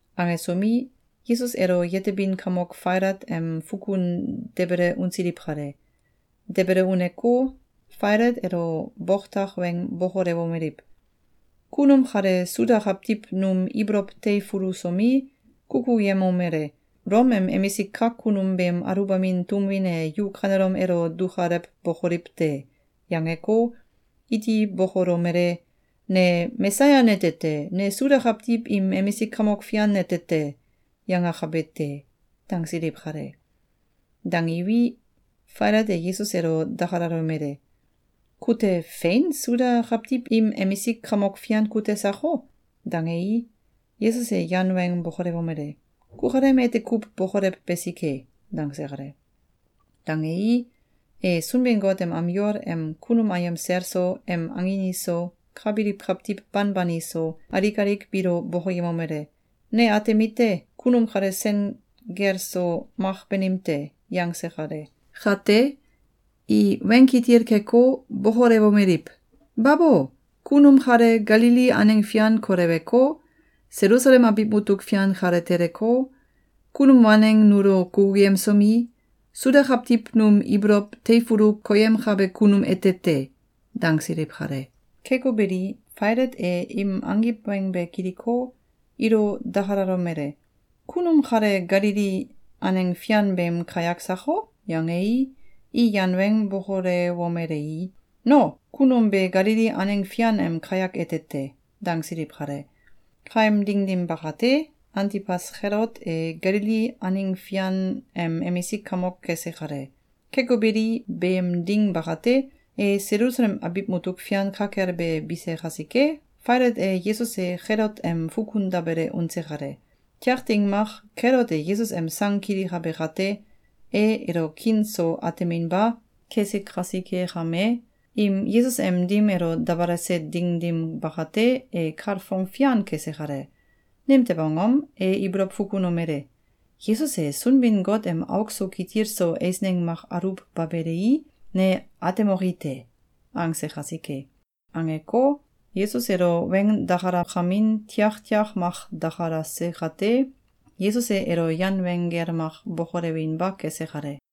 Angesomi, Yesus elo yetebin kamok Failat em fukun debele unsiliw kale. Debele uneko, Failat elo boktak weng bokolewomeliw: “Kunum kale Suda kawtiw num ibolow teifulusomi, kukuyemomele: ‘Ulom em emisik kak kunum beem aluwbamin tum win e yu kanelom elo dukalewbokoliw te!’, yangeko, iti bokolomele: ‘Ne Mesaya nete te! Ne Suda kawtiw im emisik kamok fian nete te!’, yangakabe te!”, dangsiliw kale. Dangiwi, Failat e Yesus elo dakalalomele: “Kute fein Suda kawtiw im emisik kamok fian kute sako?”, dangei, Yesus e yan weng bokolewomele: “Kukalem ete kuw bokolew besike.”, dangse kale. Dangei, e Sunbin-Got em am yol em kunum ayem sel so, em angin iso, ka biliw kawtiw banban iso, alik alik biilo bokoyemomele: “Ne atemite: Kunum kale sen gel so mak banim te!”, yangse kale. Kate, i weng kitil keko, bokolewomeliw: “Babo! Kunum kale Galili aneng fian koleweko, Selusalem abiw mutuk fian kale teleko, kunum waneng nulo kukuyemsomi, Suda kawtiw num ibolow teifulu koyemkabe kunum ete te!”, dangsiliw kale. Keko beli, Failat e im angiw weng be kiliko, ilo dakalalomele: “Kunum kale Galili aneng fian beem kayak sako?”, yangei, i yan weng bokolewomelei: “No, kunum be Galili aneng fian em kayak ete te!”, dangsiliw kale. Kaem ding dim bakate, Antibas Kelot e Galili aneng fian em emisik kamok kese kale. Keko beli, beem ding bakate, e Selusalem abiw mutuk fian ka kel be bise kasike, Failat e Yesus elo Kelot em fukun dabele unse kale. Tiak ding mak, Kelot e Yesus em sang kilikabe kate, e elo kiin so ateminba kese kasike kame, im Yesus em dim elo dabalase ding dim bakate, e kalfong fian kese kale. Nimtew angom? E ibolow fukunomele: “Yesus e Sunbin-Got em auk so kitil so eisneng mak aluwbabelei, ne atemoki te!”, angse kasike. Angko, Yesus elo weng dakalakamin tiak tiak mak dakalase kate, Yesus e elo yan weng gel mak bokolewinba kese kale.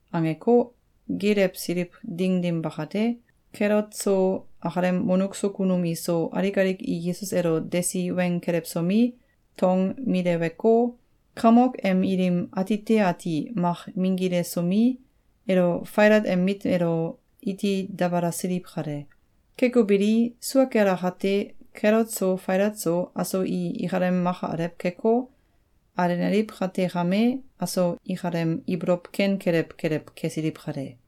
Angeko, geelewsiliw ding dim bakate, Kelot so, akalem wonuk so kunum iso, alik alik i Yesus elo desi weng kelewsomi, tong mileweko, kamok em ilim atite ati mak minggilesomi, elo Failat em mit elo iti dabalasiliw kale. Keko beli, sua kel akate, Kelot so Failat so, aso i ikalem maka alew keko, alenaliw kate kame, aso ikalem ibolow ken kelew kelew kesiliw kale.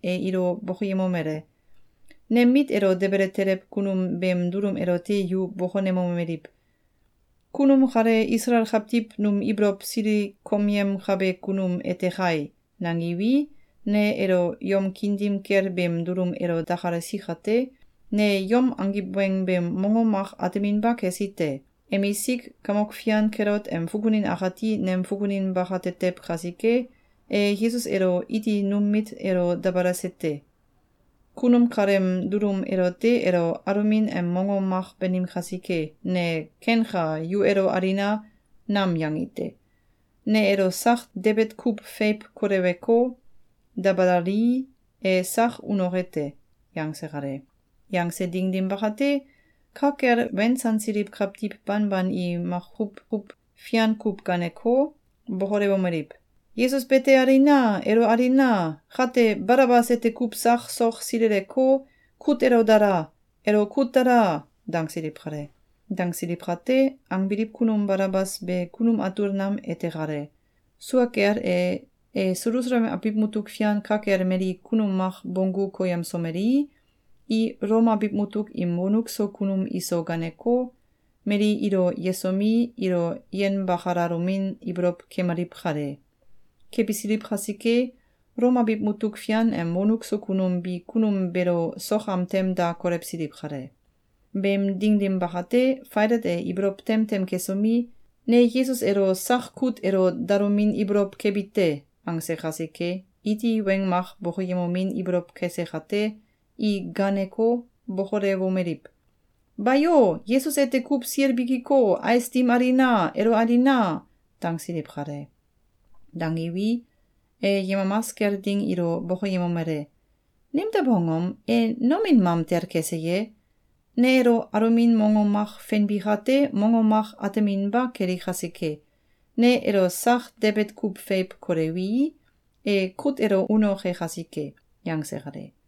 e ilo bokoyemomele: “Nem mit elo debele teliw kunum beem dulum elote yu bokonemomeliw: ‘Kunum kale Isalael kawtiw num ibolow silikomyemkabe kunum ete kai!’, nangiwi, ne elo yom kiin dim kel beem dulum elo dakalasi kate, ne yom angiw weng beem mongom mak ateminba kesi te. Emisik kamok fian Kelot em fukunin akati nem fukunin bakatetew kasike, e Yesus elo iti num mit elo dabalase te. Kunum kaleem dulum elote elo alomin em mongom mak banim kasike, ne ‘Kenka! Yu elo alina!’, nam yangi te. Ne elo sak debet kuw feiw koleweko, dabalalii, e sak unoke te.”, yangse kale. Yangse ding dim bakate, ka kel wensansiliw kawtiw banban i maku kuw fian kuw gaaneko, bokolewomeliw: “Yesus bete alina! Elo alina! Kate, Balabas ete kuw sak sok sileleko, kut elo dala! Elo kut dala!”, dangsiliw kale. Dangsiliw kate, angbiliw kunum Balabas be kunum atul nam ete kale. Sua kel e, e Selusalem abiw mutuk fian ka kel mali kunum mak bonggu koyemsomelei, i Ulom abiw mutuk im wonuk so kunum iso ganeko, mali ilo yesomi, ilo yenbakalalomin ibolow kemaliw kale. Kebisiliw kasike, Ulom abiw mutuk fian em wonuk so kunum bi kunum beelo sok am tem da kolewsiliw kale. Beem ding dim bakate, Failat e ibolow tem tem kesomi, “Ne Yesus elo sak kut elo dalomin ibolow kebi te.”, angse kasike, iti weng mak bokoyemomin ibolow kese kate, i gaaneko, bokolewomeliw: “Bayo! Yesus ete kuw sil bikiko, ais dim alina! Elo alina!”, dangsiliw kale. Dangiwi, e yemamas kel ding ilo bokoyemomele: “Nimtew angom? E nomin mamtel kese ye? Ne elo alomin mongom mak fenbi kate, mongom mak ateminba keli kasike, ne elo sak debet kuw feiw kolewii, e kut elo unoke kasike!”, yangse kale.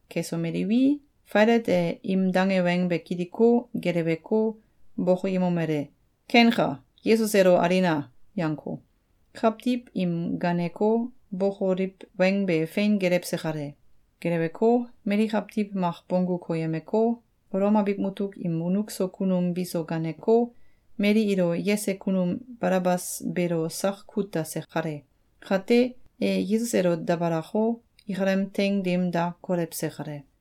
Kesomeliwi, Failat e im dange weng be kiliko, geleweko, bokoyemomele: “Kenka! Yesus elo alina!”, yangko, kawtiw im gaaneko, bokoliw weng be fein gelewse kale. Geleweko, mali kawtiw mak bonggu koyemeko, Ulom abiw mutuk im wonuk so kunum biso ganeko, mali ilo yese kunum Balabas beelo sak kut dase kale. Kate, e Yesus elo dabalako, ikalem teing dim da kolewse kale.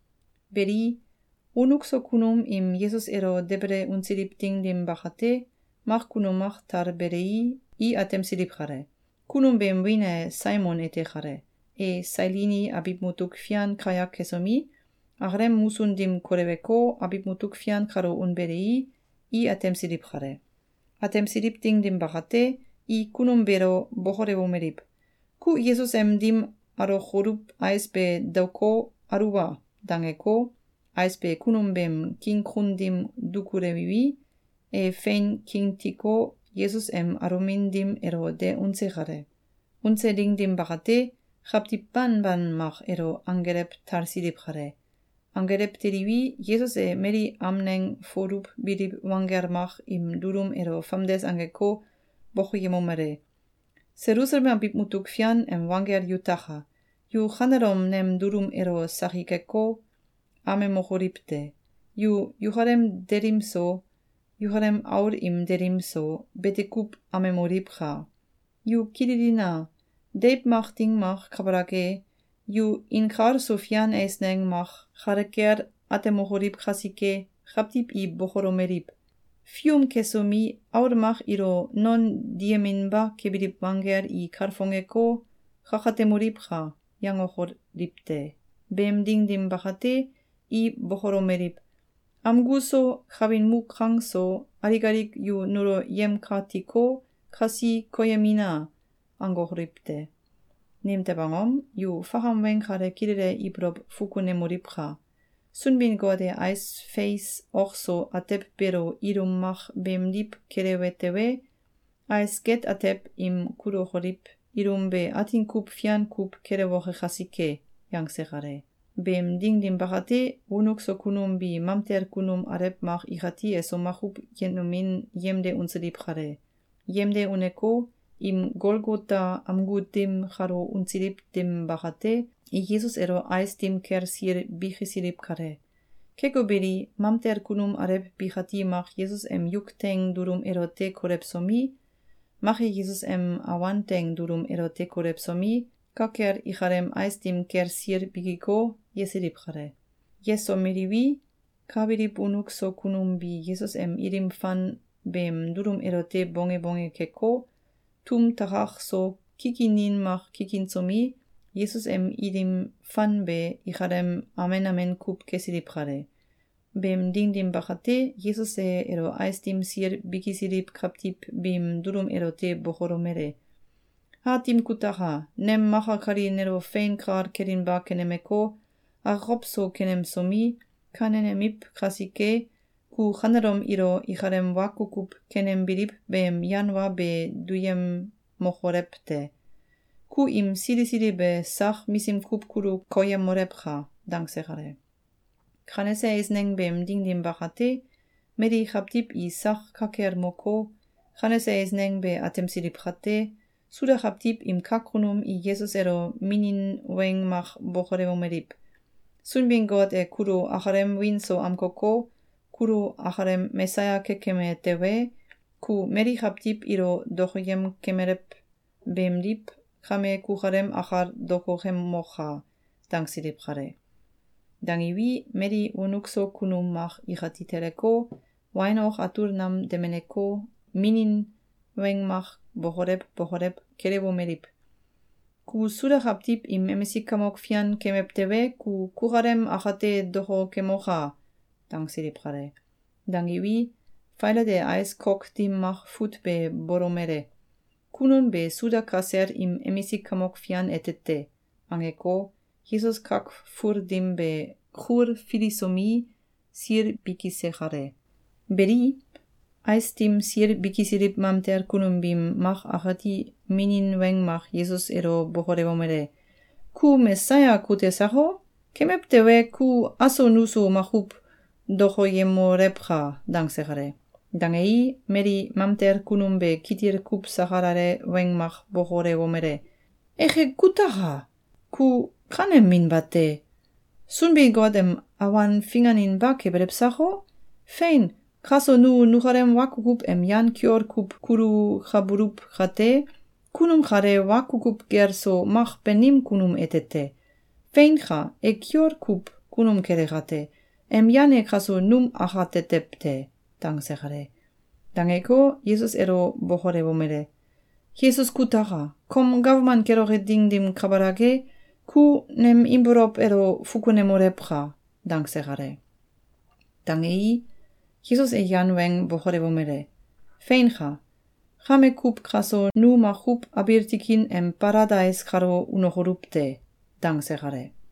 Beli, wonuk so kunum im Yesus elo debele unsiliw ding dim bakate, mak kunum mak talbelei, i atemsiliw kale. Kunum beem wiin e Saimon ete kale. E Sailini abiw mutuk fian kayak kesomi, akalem musun dim koleweko, abiw mutuk fian kalo unbelei, i atemsiliw kale. Atemsiliw ding dim bakate, i kunum beelo bokolewomeliw: “Ku Yesus em dim alokoluw ais be daoko, aluwa!”, dangeko, ais be kunum beem king kun dim dukulewiwi, e fein kingtiko, Yesus em alomin dim elo de unse kale. Unse ding dim bakate, kawtiw banban mak elo anggelew talsiliw kale. Anggelew teliwi, Yesus e mali amneng foluwbiliw wanggel mak im dulum elo famdes angeko, bokoyemomele: “Selusalem abiw mutuk fian em wanggel yutaka! Yu kanelom nem dulum elo sakikeko, amemokoliw te! Yu yukalem delim so, yukalem aul im delim so, bete kuw amemoliwka! Yu kililina! Deiw mak ding mak kabalak e, yu inkalso fian eisneng mak kale kel atemokoliw kasike, kawtiw i bokolomeliw: ‘Fium kesomi, aul mak ilo non diyeminba kebiliw wanggel i kalfongeko, kakatemoliwka!’, yangokoliw te. Beem ding dim bakate, i bokolomeliw: ‘Amgu so, kawin muk kang so, alik alik yu nulo yemkatiko, kasi koyemina!’, angokoliw te. Nimtew angom? Yu fakam weng kale kilele ibolow fukunemoliwka! Sunbin-Got e ais feis ok so atew beelo ilum mak beemdiw kelewe tewe, ais get atew im kulukoliw ilum be atin kuw fian kuw kelewoke kasike!”, yangse kale. Beem ding dim bakate, wonuk so kunum bi mamtel kunum alew mak ikati eso makuw yenomin yemde unsiliw kale. Yemde uneko, im Golgota amgu dim kalo unsiliw ding dim bakate, i Yesus elo ais dim kel sil bikisiliw kale. Keko beli, mamtel kunum alew bikati mak Yesus em yuk teing dulum elote kolewsomi, mak e Yesus em awan teing dulum elote kolewsomi, ka kel ikalem ais dim kel sil bikiko, yesiliw kale. Yesomeliwi, ka biliw wonuk so kunum bi Yesus em ilim fan beem dulum elote bonge bonge keko, tum takak so kikinin mak kikinsomi, Yesus em ilim fan be ikalem amen amen kuw kesiliw kale. Beem ding dim bakate, Yesus e elo ais dim sil bikisiliw kawtiw biim dulum elote bokolomele: “Aatim kutaka! Nem maka kali nelo fein kal kelinba kenemeko, akokow so kenemsomi, kanenemiw kasike, ku kanelom ilo ikalem wa kukuw kenembiliw beem yan wa be duyemokolew te! Ku im sili sili be sak misim kuw kulu koyemolewka!”, dangse kale. Kanese eisneng beem ding dim bakate, mali kawtiw i sak ka kel moko, kanese eisneng be atemsiliw kate, Suda kawtiw im kak kunum i Yesus elo minin weng mak bokolewomeliw: “Sunbin-Got e kulo akalem wiin so amkoko, kulo akalem Mesaya kekeme tewe, ku mali kawtiw ilo dokoyem kemelew beemdiw, kame kukalem akal dokokemoka!”, dangsiliw kale. Dangiwi, mali wonuk so kunum mak ikati teleko, wain ok atul nam demeneko, minin weng mak bokolew bokolew kelewomeliw: “Ku Suda kawtiw im emisik kamok fian kemew tewe, ku kukalem akate dokokemoka!”, dangsiliw kale. Dangiwi, Failat e ais kok dim mak fut be bolomele: “Kunum be Suda kasel im emisik kamok fian ete te!”, angeko, Yesus kak ful dim be kulfilisomi, sil bikise kale. Beli, ais dim sil bikisiliw mamtel kunum biim mak akati minin weng mak Yesus elo bokolewomele: “Ku Mesaya kute sako? Kemew tewe, ku aso nuso makuw dokoyemolewka!”, dangse kale. Dangei, mali mamtel kunum be kitil kuw sakalale weng mak bokolewomele: “Eke kutaka! Ku kanem min bate! Sunbin-Got em awan finganinba kebelew sako? Fein, kaso nu nukalem wa kukuw em yan kiol kuw kulukabuluw kate, kunum kale wa kukuw gel so mak banim kunum ete te. Feinka! E kiol kuw kunum kele kate, em yan e kaso num akatetew te.”, dangse kale. Dangeko, Yesus elo bokolewomele: “Yesus kutaka! Kom gawman keloke ding dim kabalak e, ku nem ibolow elo fukunemolewka!”, dangse kale. Dangei, Yesus e yan weng bokolewomele: “Feinka! Kame kuw kaso nu makuw abiil tikin em Baladais kalo unokoluw te!”, dangse kale.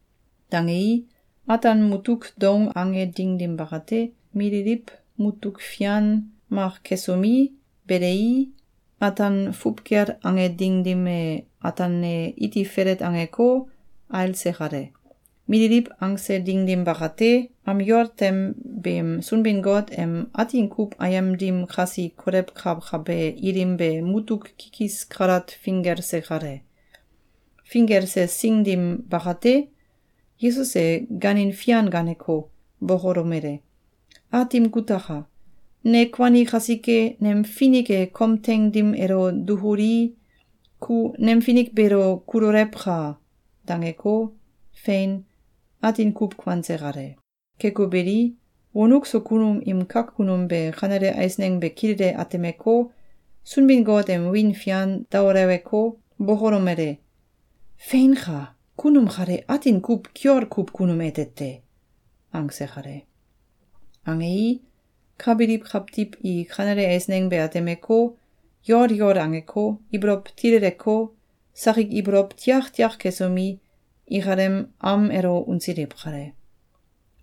Dangei, ataan mutuk doung ange ding dim bakate, mililiw mutuk fian mak kesomi, belei, ataan fuwkel ange ding dim e, ataan e iti felet angeko, ailse kale. Mililiw angse ding dim bakate, am yol tem beem Sunbin-Got em Atin kuw Ayem dim kasi kolewkakabe ilim be mutuk kikis kalat finggelse kale. Finggelse sing dim bakate, Yesus e gaanin fian gaaneko, bokolomele: “Aatim kutaka! Ne kuani kasike, nem finik e kom teing dim elo dukulii, ku nem finik beelo kulolewka!”, dangeko, fein, atin kuw kuanse kale. Keko beli, wonuk so kunum im kak kunum be kanele eisneng be kilele atemeko, Sunbin-Got em wiin fian daoleweko, bokolomele: “Feinka! Kunum kale atin kuw kiol kuw kunum ete te!”, angse kale. Angei, ka biliw kawtiw i kanele eiseng be atemeko, yol yol angeko, ibolow tileleko, sakik ibolow tiaktiak kesomi, ikalem am elo unsiliw kale.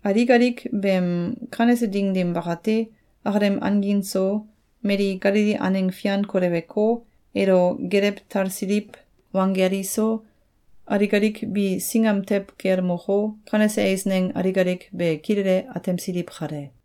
Alik alik beem kanese ding dim bakate, akalem angin so, mali Galili aneng fian koleweko, elo gelew talsiliw wanggel iso, alik alik bi singam tew kel moko, kanese eisneng alik alik be kilele atemsiliw kale.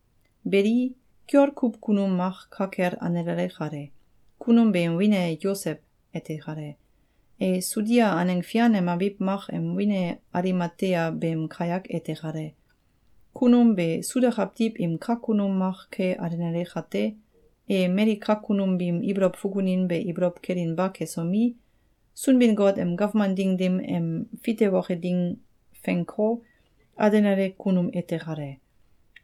Beli, kiol kuw kunum mak ka kel alenale kale. Kunum beem wiin e Yosew ete kale. E Sudia aneng fian em abiw mak em wiin e Alimatea beem kayak ete kale. Kunum be Suda kawtiw im kak kunum mak ke alenale kate, e mali kak kunum biim ibolow fukunin be ibolow kelinba kesomi, Sunbin-Got em gawman ding dim em fitewoke ding fenko, alenale kunum ete kale.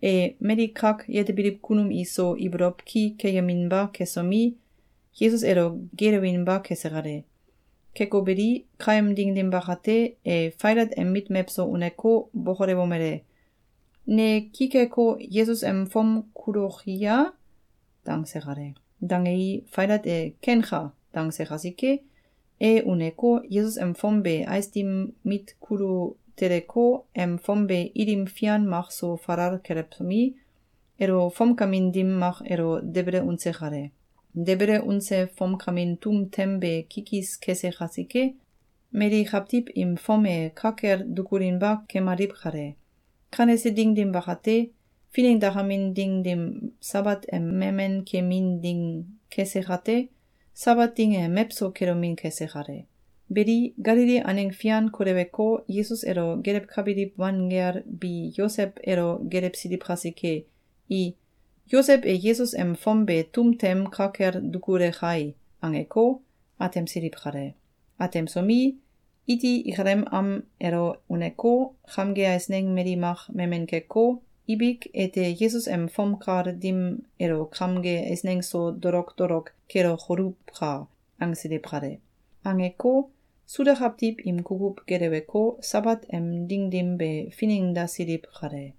E mali kak yetebiliw kunum iso ibolow ki keyeminba kesomi, Yesus elo geelewinba kese kale. Keko beli, kaem ding dim bakate, e Failat em mit mewso uneko, bokolewomele: “Ne ki keko, Yesus em fom kuloki ya?”, dangse kale. Dangei, Failat e “Kenka!”, dangse kasike, e uneko, Yesus em fom be ais dim mit kulu teleko, em fom be ilim fian mak so falal kelewsomi, elo fomkamin dim mak elo debele unse kale. Debele unse fomkamin tum tem be kikis kese kasike, mali kawtiw im fom e ka kel dukulinba kemaliw kale. Kanese ding dim bakate, finengdakamin ding dim Sabat em memen kemin ding kese kate, Sabat ding e mewso kelomin kese kale. Beli, Galili aneng fian koleweko, Yesus elo gelewkakabiliw wanggel bi Yosew elo gelewsiliw kasike, i “Yosew e Yesus em fom be tum tem ka kel dukule kai!”, angeko, atemsiliw kale. Atemsomi, iti ikalem am elo uneko, kamge eisneng mali mak memen keko, “Ibik ete Yesus em fom kal dim elo kamge eisneng so dolok dolok kelokoluwka!”, angsiliw kale. Angeko, Suda kawtiw im kukuw geleweko, Sabat em ding dim be finengdasiliw kale.